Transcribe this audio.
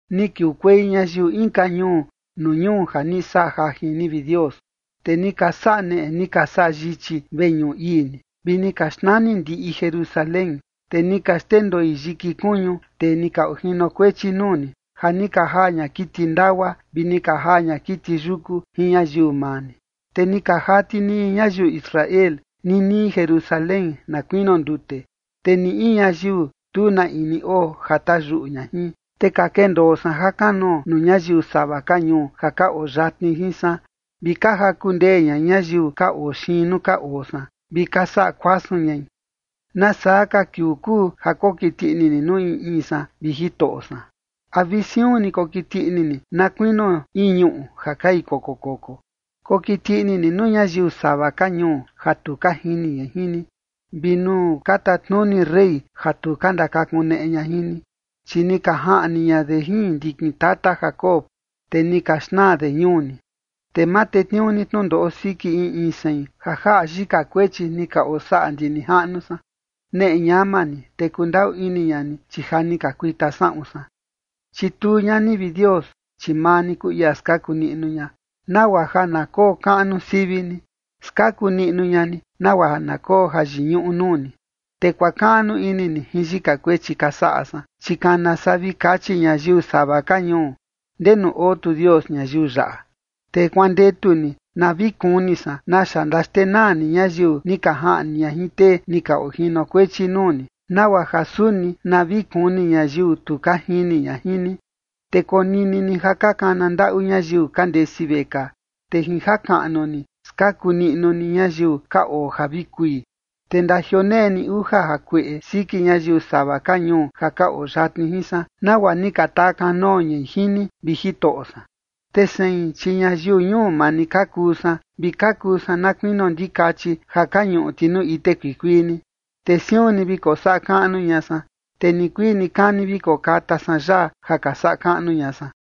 Ni kiukuei ñayiu inka ñuu nuu ñuu ja ni saꞌa jajin ni, vi Dios, te ni ka saꞌa neꞌe ni ka saꞌa yichi veñuꞌu ii ni, vi ni ka xnani ndiꞌi Jerusalén. Te ni ka xndendoi yiki kuñu tee ni ka ojinokuechi nuu ni, ja ni ka jaa ña kiti ndagua, vi ni ka jaa ña kiti yuku jin ñayiu maa ni. Te ni ka jati niñi ñayiu Israel ninii Jerusalén na kuinio ndute, te ni in ñayiu, tu na in ni oo ja tayuꞌu ña jin. Te ka kendoo san jakanoo nuu ñayiu sava ka ñuu ja ka oo yatni jin san, vi ka jaku ndee ña ñayiu ka oo xiin nuu ka oo san, vi ka saꞌa kuasun ñai. ¿Nasaa ka kiuu kuu ja kokiti ini ni nuu in in san, vi Jitoꞌo san? ¿A vi siun ni kokiti ini ni, na kuinio in ñuꞌu ja kai koko koko? Kokiti ini ni nuu ñayiu sava ka ñuu ja tu ka jini ña jin ni, vi nuu ka tatnuni rey ja tu ka ndakakuneꞌe ña jin ni. Chi ni ka jaꞌni ña de jin ndikin tata Jacob, te ni ka xnaa de ñuu ni. Te ma tetniuu ni tnundoꞌo siki in in sein ja jaꞌa yika kuechi ni ka osaꞌa ndi nijaꞌnu san. Neꞌe ñama ni, te kundaꞌu ini ña ni, chi ja ni ka kuita saꞌun san. Chituu ña ni, vi Dios, chi maa ni kuu ia skaku niꞌnu ña, nagua ja na kokaꞌnu sivi ni. Skaku niꞌnu ña ni nagua ja na koo jayiñuꞌu nuu ni, te kuakaꞌnu ini ni jin yika kuechi ka saꞌa san. Chi kana saa vi kachi ñayiu sava ka ñuu: “¿Ndenu oo tu Dios ñayiu yaꞌa?” Te kuandetu ni na vi kuni san naxa ndaxtenaa ni ñayiu ni ka jaꞌni ña jin tee ni ka ojinokuechi nuu ni, nagua ja suni na vi kuni ñayiu tu ka jini ña jin ni. Te konini ni ja ka kana ndaꞌu ñayiu ka ndesi vekaa, te jin ja jakaꞌnu ni skaku niꞌnu ni ñayiu ka oo ja vi kui. Te ndajioneꞌe ni uja jakueꞌe siki ñayiu sava ka ñuu ja ka oo yatni jin san, nagua ni ka takanoo ñai jin ni, vi Jitoꞌo san. Te sein, chi ñayiu ñuu maa ni ka kuu san, vi ka kuu san na kuinio ndikachi ja ka ñuꞌu ti nuu ite kuikuii ni, te siun ni vi kosaꞌa kaꞌnu ña san, te nikuii nikani vi kokata san yaa ja ka saꞌa kaꞌnu ña san.